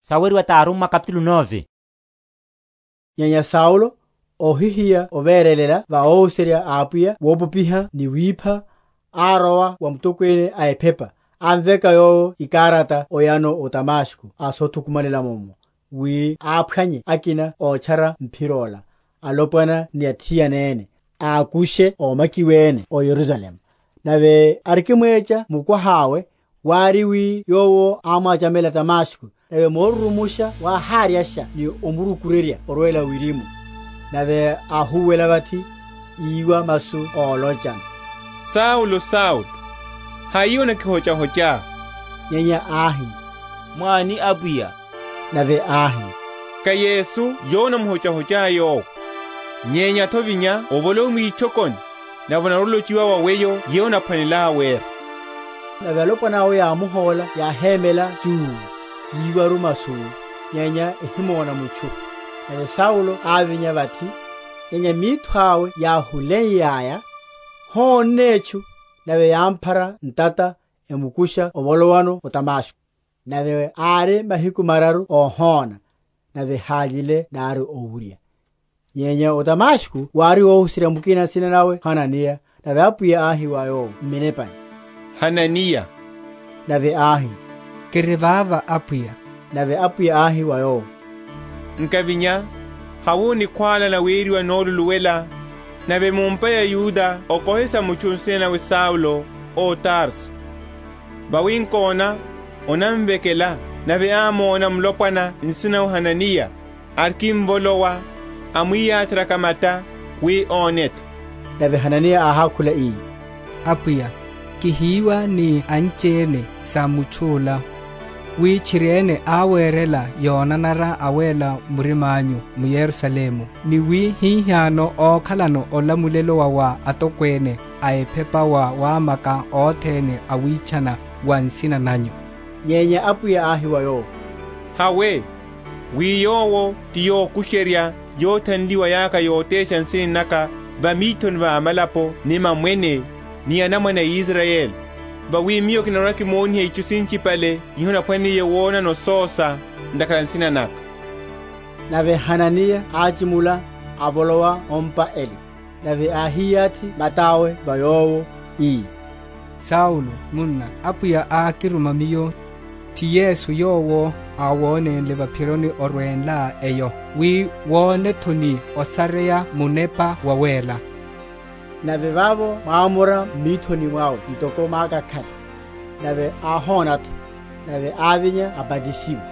Otcharuwa wa Paulo vaphironi yó Damasko. Nyenya Saulo, óhihiya overelela va óhuserya a Apwiya wopopiha ni wipha, árowa wa mutokwene a ephepa, amveka yowo ikarata oyano o Damasko o sothukumanela’mo, wi aphwannye akina ótchara Mphiro ola, alopwana ni athiana ene, ákushe ómakiwene o Yerusalemu. Nave arikimwecha mukwaha’we, wári wi yowo ámwachamela Damasko: nave moruru?-?musha wáháryasha ni omurukurerya orwela wirimu; nave áhúwela vathi, íwa masu ólochano, Saulo, Saulo, hai onakihochahochá? Nyenya áhi, Mwáni Apwiya? Nave áhi, Ká Yesu yowo onamuhochahochá yowe; nyenya nto, vinya, ovolowe mwitchokoni, nave onarwa‐olochiwa wa weyo yeyo onaphwanelá wera. Nave alopwana awo yámuhóla yáhémela chuu, yiwaru masu, nyenya ehimona mutchu. Nave Saulo ávinya vathi; nyenya mitho awe yáhuleiyaya, hónne etchu; nave yámphara ntata, emukusha ovolowano o Damasko. Nave ári mahiku mararu óhóna, nave hályile nari owurya. Nyenya o Damasko wári óhuserya mukina nsina nawe Hananiya; nave Apwiya áhi wa yowo m’minepani, Hananiya. Nave áhi, Kiri vava, Apwiya. Nave Apwiya áhi wa yowo, Nkavinya, hawe o nikhwála naweriwa Noluluwela, nave mu’mpa ya Yuda okohe sa mutchu nsina nawe Saulo, ó Tarso: vawi nkona, onamvekela; nave ámóna mulopwana nsina nawe Hananiya, arikimvolowa, amwiyatheryaka mata, wi one’tho. Nave Hananiya áhákhula ii, Apwiya, kihiwa ni anchiene sa mutchu’la, wi tchiri áwerela yonanara awela‐murima’nyu m’Yerusalemu; ni wi hihano ókhalano olamulelo wa wa atokwene a ephepa wa wamaka othene awitchana va nsina nanyu. Nyenya Apwiya áhi wa yowo, Hawe: wi yowo ti yokusherya yothanliwa yaka yotesha nsina naka va mithoni va amalapo ni mamwene, ni anamwane a Israyeli: vawi Miyo kinarwa‐kimoniha itchu sinchipale iho onaphwaneliye wonano ososa ntakhara a nsina naka. Nave Hananiya áchimula, avolowa o’mpa ele; nave áhiyathi mata’we va yowo, ii, Saulo, munna, Apwiya ákiruma miyo, ti Yesu yowo áwonénle va’phironi orwenlá eyo, wi wone’tho, ni osareya Munepa Wawéla. Nave vavo mwámora m’mithoni mwawe ntoko mákakhale, nave áhona’tho; nave ávinya abatisiwa;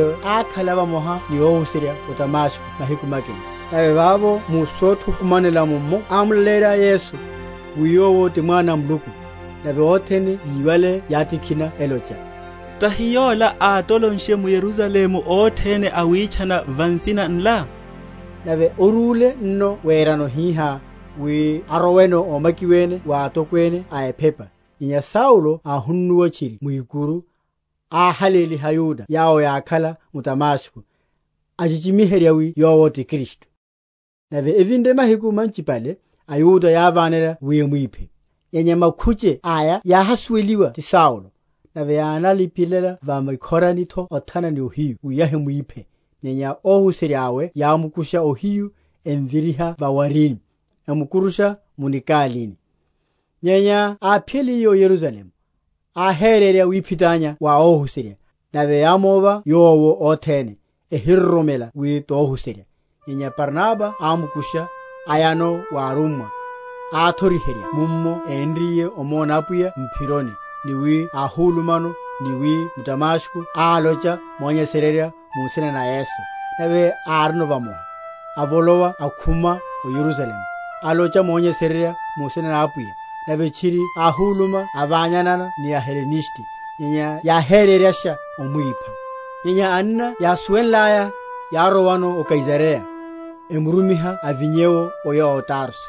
Nave ákhala vamoha ni óhuserya o Damasko mahiku makina. Nave vavo mu sothukumanela’mmo ámulaleyerya Yesu, wi Yowo ti Mwana a Muluku. Nave othene yíwale yátikhina elocha, Tahi yola átolonshe m’Yerusalemu othene awitchana va nsina nla? Nave orúle nno werano hihá, wi aroweno ómakiwene wa atokwene a ephepa. Nyenya Saulo áhunnuwa tchiri mwikuru, áhaléliha aYuda yawo yákhala m’Damasko, achichimiherya wi yowo ti Kristu. Nave evinre mahiku manchipale, aYuda yávánela wi emwiphe: nyenya makhuche aya yáhasuweliwa ti Saulo. Nave yánalipelela va mikhorani’tho othana ni ohiyu wi yahimwíphe; nyenya óhuserya’we yámukusha ohiyu, emviriha va’warini, emukurusha mu nikalini. Nyenya áphiyaliye o Yerusalemu, áhererya wiphitanya wa óhuserya: nave yámova yowo othene, ehinaroromela wi tohuserya. Nyenya Barnaba ámukusha, ayano wa arummwa, áthoriherya mummo énriye omona Apwiya m’phironi, ni wi áhulumano, ni wi m’Damasko álocha monyesererya mu nsina na Yesu. Nave árino vamoha, avolowa akhuma o Yerusalemu, alocha monyesererya mu nsina na Apwiya; nave tchiri áhuluma avanyana ni a Heleniste; nyenya yáhereryasha omwipha. Nyenya anna yásuwenlaya, yárowano o Kaisareya, emurumiha avinye’wo oya o Tarso.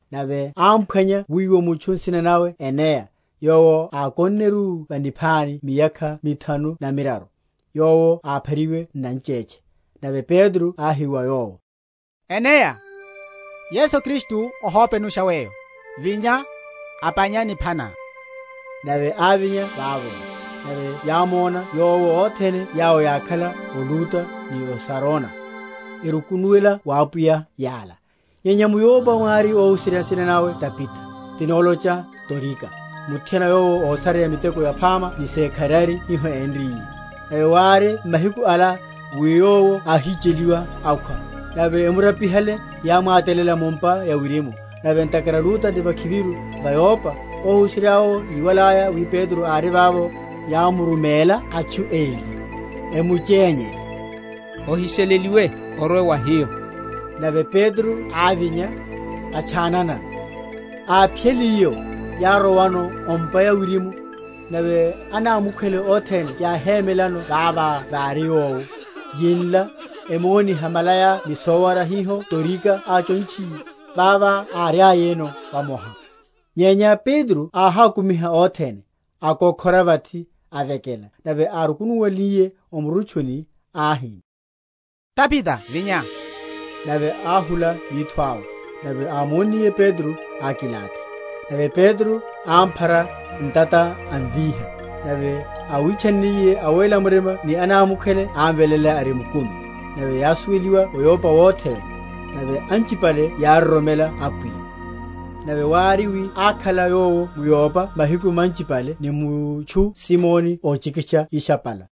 Nave ámphwanya wiwo mutchu nsina nawe Eneya, yowo ákonneru va niphani miyakha mithanu na miraru; yowo áphariwe n’nanchetche. Nave Petro áhi wa yowo, Eneya, Yesu Kristu ohópenusha weyo; vinya, apánya nipha ná. Nave ávinya vavo. Nave yámona yowo othene yawo yákhala o Luda ni o Sarona, erukunuwela wa Apwiya yala. Nyenya m’Yopa mwári óhuserya nsina nawe Tabita, tin’nalocha Dorika; muthiana yowo ásareya miteko yaphama ni sekharari hiho énriye. Nave wári m’mahiku ala, wi yowo áhicheliwa, akhwa; nave emurapihale yámwatalela mu’mpa ya wirimu. Nave ntakhara Luda ti vakhiviru va Yopa, óhuserya’wo yíwalaya wi Petro ári vavo, yámurumela atchu eli, emuchényerya, Ohisheleliwe orwe wa hiyo. Nave Petro ávinya, atchananano. Áphiyaliye’wo, yárowano o’mpa ya wirimu: nave anámukhwele othene yáhemelela vavo vári yowo, yinla, emoniha malaya ni sowara hiho Dorika áchontchiye, vava áriayano vamoha. Nyenya Petro áhákumiha othene, akokhora vathi, avekela; nave árukunuwenliye o murutchuni ahi, Tabita vinya. Nave áhula mitho awe; nave ámonniye Petro, ákilathi. Nave Petro ámphara ntata, amvíha; nave áwitchanniye awéla‐murima ni anámukhwele ámveléla ari mukumi. Nave yásuweliwa o Yopa wothe wene: nave anchipale yároromela Apwiya. Nave wári, wi ákhala yowo m’Yopa mahiku manchipale ni mutchu Simoni óchikitcha ishapala.